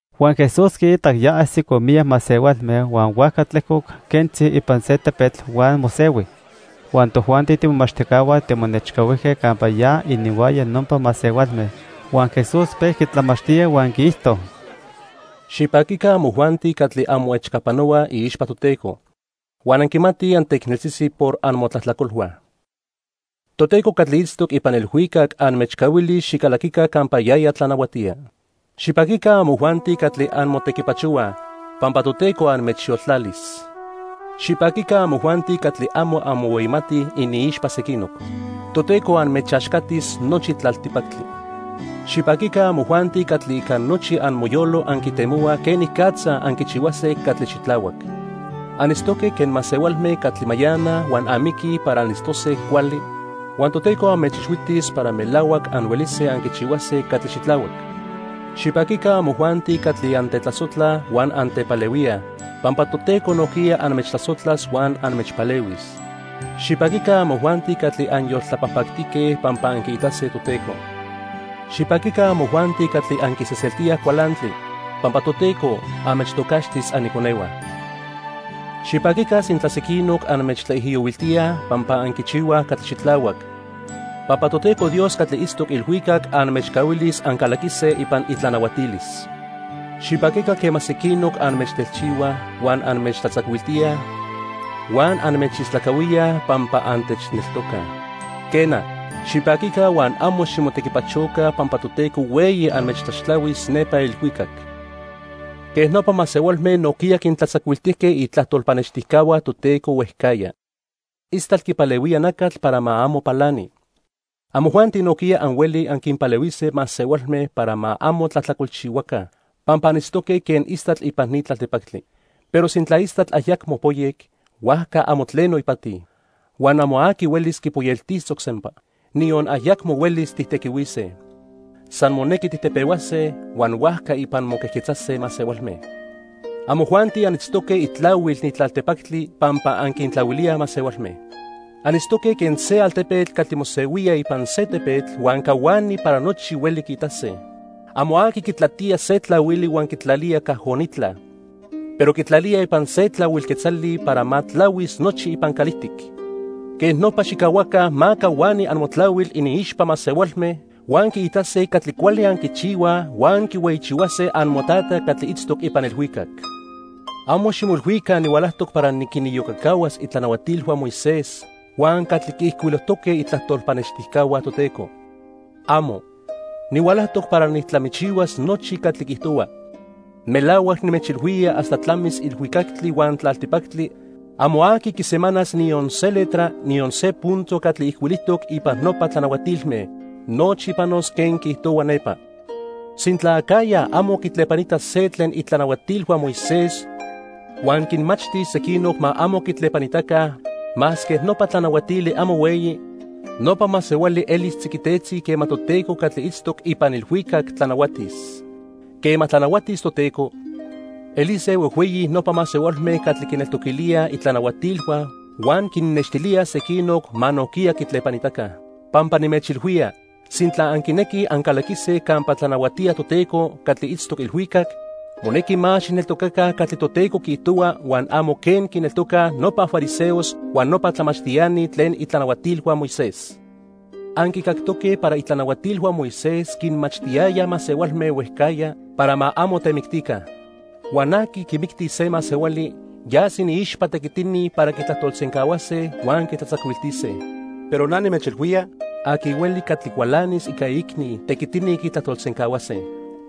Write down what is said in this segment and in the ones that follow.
Huan Jesús quiitac ya ajsicoj miyac masehualme huan huajca tlejcoc quentzi ipan se tepetl huan mosehui. Huan tojuanti tiimomachtijcahua timonechcahuijque campa ya ininhuaya nopa masehualme. Huan Jesús pejqui tlamachtía huan quiijto: "Xipaquica amojuanti catli anmoechcapanohuaj iixpa Toteco, huan anquimatij anteicneltzitzi por amotlajtlacolhua. Toteco catli itztoc ipan ilhuicac anmechcahuilis xicalaquica campa yaya tlanahuatía. Xipaquica amojuanti catli anmotequipachohuaj, pampa Toteco anmechyoltlalis. Xipaquica amojuanti catli amo anmohueyimatij iniixpa sequinoc. Toteco anmechaxcatis nochi tlaltipactli. Xipaquica amojuanti catli ica nochi amoyolo anquitemohuaj quenicatza anquichihuase catli xitlahuac. Anitztoque quen masehualme catli mayanaj huan amiquij para anitztose cuali, huan Toteco anmechixhuitis para melahuac anhuelise anquichihuase catli xitlahuac. Xipaquica amojuanti catli antetlasojtlaj huan antepalehuíaj, pampa Toteco nojquiya anmechtlasojtlas huan anmechpalehuis. Xipaquica amojuanti catli anyoltlapajpactique, pampa anquiitase Toteco. Xipaquica amojuanti catli anquisejseltíaj cualantli, pampa Toteco anmechtocaxtis aniconehua. Xipaquica sintla sequinoc anmechtlaijiyohuiltíaj pampa anquichihuaj catli xitlahuac, pampa Toteco Dios catli itztoc ilhuicac anmechcahuilis ancalaquise ipan itlanahuatilis. "Xipaquica quema sequinoc anmechtelchihuaj, huan anmechtlatzacuiltíaj huan anmechistlacahuíaj pampa antechneltocaj." Quena, xipaquica huan amo ximotequipachoca pampa Toteco hueyi anmechtlaxtlahuis nepa ilhuicac. Quej nopa masehualme nojquiya quintlatzacuiltijque itlajtol pannextijcahua Toteco huejcajya. "Istatl quipalehuía nacatl para ma amo palani. Amojuanti nojquiya anhuelij anquinpalehuise masehualme para ma amo tlajtlacolchihuaca pampa anitztoque quen istatl ipan ni tlaltipactli. Pero sintla istatl ayacmo poyec, huajca amo tleno ipati. Huan amo aqui huelis quipoyeltisoc sempa. Niyon ayacmo huelis tijtequihuise. San monequi tijtepehuase, huan huajca ipan moquejquetzase masehualme. "Amojuanti anitztoque itlahuil ni tlaltipactli, pampa anquintlahuilíaj masehualme. Anitztoque quen se altepetl catli mosehuía ipan se tepetl huan cahuani para nochi hueli quiitase. Amo aqui quitlatía se tlahuili huan quitlalía cajonitla, pero quitlalía ipan se tlahuil quetzali para ma tlahuis nochi ipan calijtic. Quej nopa xijcahuaca ma cahuani amotlahuil iniixpa masehualme huan quiitase catli cuali anquichihuaj huan quihueyichihuase amoTata catli itztoc ipan ilhuicac. "Amo ximoilhuica nihualajtoc para niquiniyocacahuas itlanahuatilhua Moisés huan catli quiijcuilojtoque itlajtol pannextijcahua Toteco. ¡Amo! Nihualajtoc para nijtlamichihuas nochi catli quiijtohuaj. Melahuac nimechilhuía hasta tlamis ilhuicactli huan tlaltipactli amo aqui quisemanas niyon se letra, niyon se punto catli ijcuilijtoc ipan nopa tlanahuatilme. Nochi panos quen quiijtohua nepa. Sintla acajya amo quitlepanita se tlen itlanahuatilhua Moisés huan quinmachtis sequinoc ma amo quitlepanitaca, masque nopa tlanahuatili amo hueyi, nopa masehuali elis tziquitetzi quema Toteco catli itztoc ipan ilhuicac tlanahuatis. Quema tlanahuatis Toteco, elise huejhueyi nopa masehualme catli quineltoquilíaj itlanahuatilhua huan quinnextilíaj sequinoc ma nojquiya quitlepanitaca. Pampa nimechilhuía, sintla anquinequij ancalaquise campa tlanahuatía Toteco catli itztoc ilhuicac, monequi más xijneltocaca catli Toteco quiijtohua huan amo quen quineltocaj nopa fariseos huan nopa tlamachtiani tlen itlanahuatilhua Moisés. "Anquicactoque para itlanahuatilhua Moisés quinmachtiyayaj masehualme huejcajya para ma amo temictica. Huan aqui quimictis se masehuali yas iniixpa tequitini para quitlajtolsencahuase huan quitlatzacuiltise. Pero na nimechilhuía, aqui hueli catli cualanis ica iicni, tequitini quitlajtolsencahuase.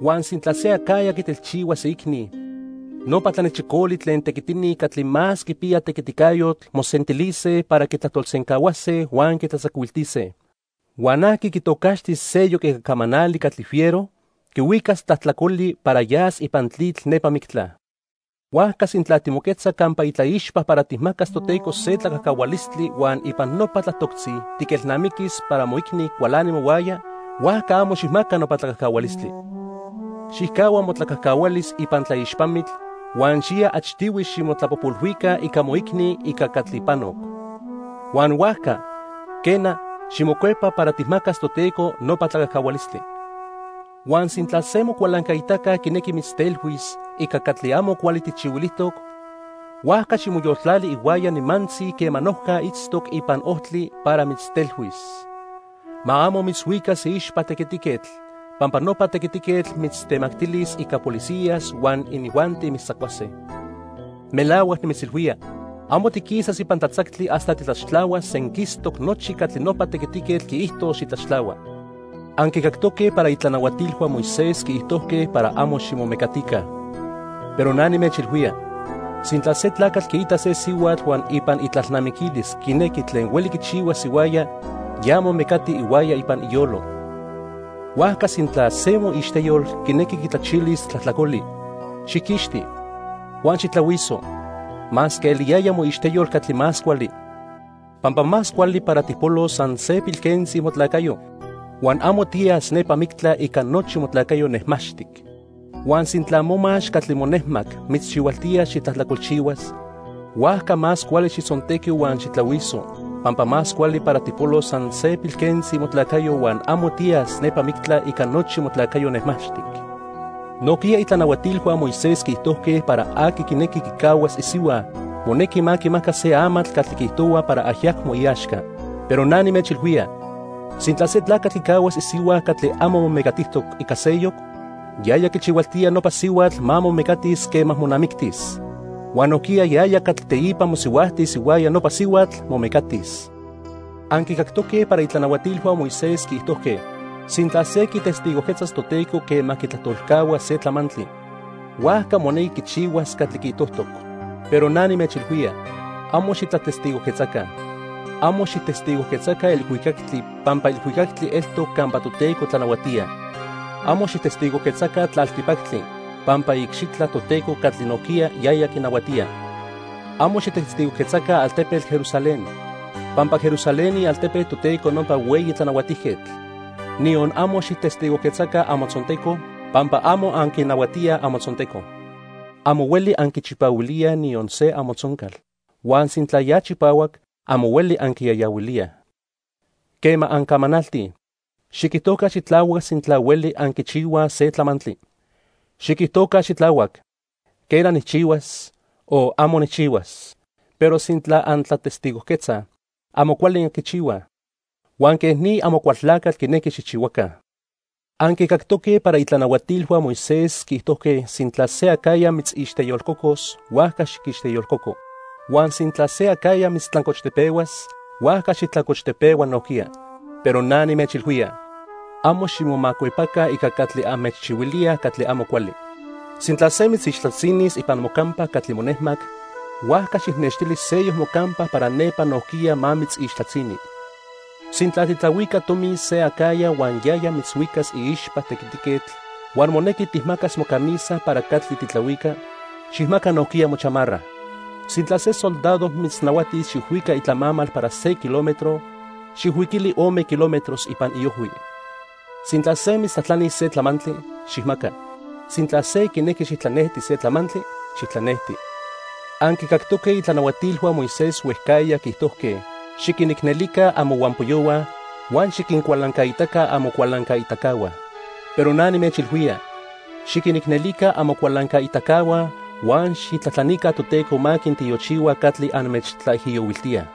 Huan sintla se acajya quitelchihuas iicni, nopa tlanechicoli tlen tequitini catli más quipiyaj tequiticayotl mosentilise para quitlajtolsencahuase huan quitlatzacuiltise. Huan aqui quitocaxtis seyoc ica camanali catli fiero, quihuicas tlajtlacoli para yas ipan tlitl nepa mictla. "Huajca sintla timoquetza campa itlaixpa para tijmacas Toteco se tlacajcahualistli huan ipan nopa tlatoctzi tiquelnamiquis para moicni cualani mohuaya, huajca amo xijmaca nopa tlacajcahualistli. Xijcahua motlacajcahualis ipan tlaixpamitl huan xiya achtihui ximotlapojpolhuica ica moicni ica catli panoc. Huan huajca, quena, ximocuepa para tijmacas Toteco nopa tlacajcahualistli. "Huan sintla se mocualancaitaca quinequi mitztelhuis ica catli amo cuali tijchihuilijtoc, huajca ximoyoltlali ihuaya nimantzi quema noja itztoc ipan ojtli para mitztelhuis. Ma amo mitzhuicas iixpa tequitiquetl, pampa nopa tequitiquetl mitztemactilis ica policías huan inijuanti mitztzacuase. Melahuac nimitzilhuía, amo tiquisas ipan tlatzactli hasta titlaxtlahuas senquistoc nochi catli nopa tequitiquetl quiijtos xitlaxtlahua. "Anquicactoque para itlanahuatilhua Moisés quiijtojque para amo ximomecatica. Pero na nimechilhuía, sintla se tlacatl quiita se sihuatl huan ipan itlalnamiquilis quinequi tlen hueli quichihuas ihuaya, ya momecati ihuaya ipan iyolo. "Huajca sintla se moixteyol quinequi quitlachilis tlajtlacoli, xijquixti huan xijtlahuiso, masque eliyaya moixteyol catli más cuali. Pampa más cuali para tijpolos san se pilquentzi motlacayo, huan amo tiyas nepa mictla ica nochi motlacayo nejmaxtic. Huan sintla momax catli monejmac mitzchihualtía xitlajtlacolchihuas, huajca más cuali xijtzontequi huan xijtlahuiso, pampa más cuali para tijpolos san se pilquentzi motlacayo huan amo tiyas nepa mictla ica nochi motlacayo nejmaxtic. "Nojquiya itlanahuatilhua Moisés quiijtojque para aqui quinequi quicahuas isihua, monequi ma quimaca se amatl catli quiijtohua para ayacmo iaxca. Pero na nimechilhuía, sintla se tlacatl quicahuas isihua catli amo momecatijtoc ica seyoc, yaya quichihualtía nopa sihuatl ma momecatis quema monamictis. Huan nojquiya yaya catli teipa mosihuajtis ihuaya nopa sihuatl, momecatis. "Anquicactoque para itlanahuatilhua Moisés quiijtojque sintla se quitestigojquetzas Toteco quema quitlajtolcahua se tlamantli, huajca monequi quichihuas catli quiijtojtoc. Pero na nimechilhuía, amo xitlatestigojquetzaca. Amo xijtestigojquetzaca ilhuicactli pampa ilhuicactli eltoc campa Toteco tlanahuatía. Amo xijtestigojquetzaca tlaltipactli pampa iicxitla Toteco catli nojquiya yaya quinahuatía. Amo xijtestigojquetzaca altepetl Jerusalén, pampa Jerusalén ialtepe Toteco nopa Hueyi Tlanahuatijquetl. Niyon amo xijtestigojquetzaca amotzonteco pampa amo anquinahuatíaj amotzonteco. Amo hueli anquichipahuilíaj niyon se amotzoncal, huan sintla ya chipahuac, amo hueli anquiyayahuilíaj. Quema ancamanaltij, xiquijtoca xitlahuac sintla hueli anquichihuaj se tlamantli. Xiquijtoca xitlahuac 'quena, nijchihuas' o 'amo nijchihuas', pero sintla antlatestigojquetzaj, amo cuali anquichihuaj, huan quej ni Amocualtlacatl quinequi xijchihuaca. "Anquicactoque para itlanahuatilhua Moisés quiijtojque sintla se acajya mitzixteyolcocos, huajca xiquixteyolcoco. Huan sintla se acajya mitztlancochtepehuas, huajca xijtlancochtepehua nojquiya. Pero na nimechilhuía, amo ximomacuepaca ica catli anmechchihuilíaj catli amo cuali. Sintla se mitzixtlatzinis ipan mocampa catli monejmac, huajca xijnextili seyoc mocampa para nepa nojquiya ma mitzixtlatzini. Sintla tijtlahuica tomi se acajya huan yaya mitzhuicas iixpa tequitiquetl huan monequi tijmacas mocamisa para catli tijtlahuica, xijmaca nojquiya mochamarra. Sintla se soldado mitznahuatis xijhuica itlamamal para se kilómetro, xijhuiquili ome kilómetros ipan iojhui. Sintla se mitztlajtlanis se tlamantli, xijmaca. Sintla se quinequi xijtlanejti se tlamantli, xijtlanejti. "Anquicactoque itlanahuatilhua Moisés huejcajya quiijtojque xiquinicnelica amohuampoyohua huan xiquincualancaitaca amocualancaitacahua. Pero na nimechilhuía, xiquinicnelica amocualancaitacahua huan xijtlajtlanica Toteco ma quintiochihua catli anmechtlaijiyohuiltíaj.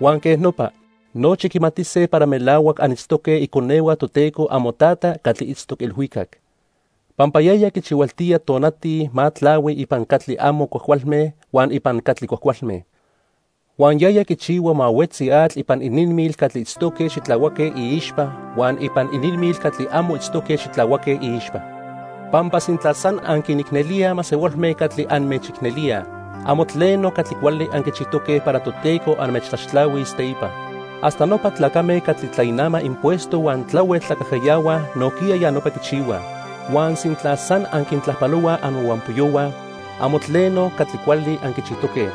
Huan quej nopa, nochi quimatise para melahuac anitztoque iconehua Toteco amoTata catli itztoc ilhuicac. Pampa yaya quichihualtía tonati ma tlahui ipan catli amo cuajcualme huan ipan catli cuajcualme. Huan yaya quichihua ma huetzi atl ipan ininmil catli itztoque xitlahuaque iixpa huan ipan ininmil catli amo itztoque xitlahuaque iixpa. Pampa sintla san anquinicnelíaj masehualme catli anmechicnelíaj, amo tleno catli cuali anquichijtoque para Toteco anmechtlaxtlahuis teipa. Hasta nopa tlacame catli tlainamaj impuesto huan tlahuel tlacajcayahuaj nojquiya ya nopa quichihuaj. Huan sintla san anquintlajpalohuaj amohuampoyohua, amo tleno catli cuali anquichijtoque.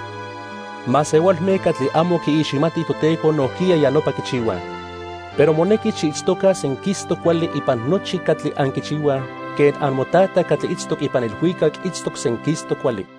Masehualme catli amo quiiximatij Toteco nojquiya ya nopa quichihuaj. Pero monequi xiitztoca senquistoc cuali ipan nochi catli anquichihuaj quen amoTata catli itztoc ipan ilhuicac itztoc senquistoc cuali.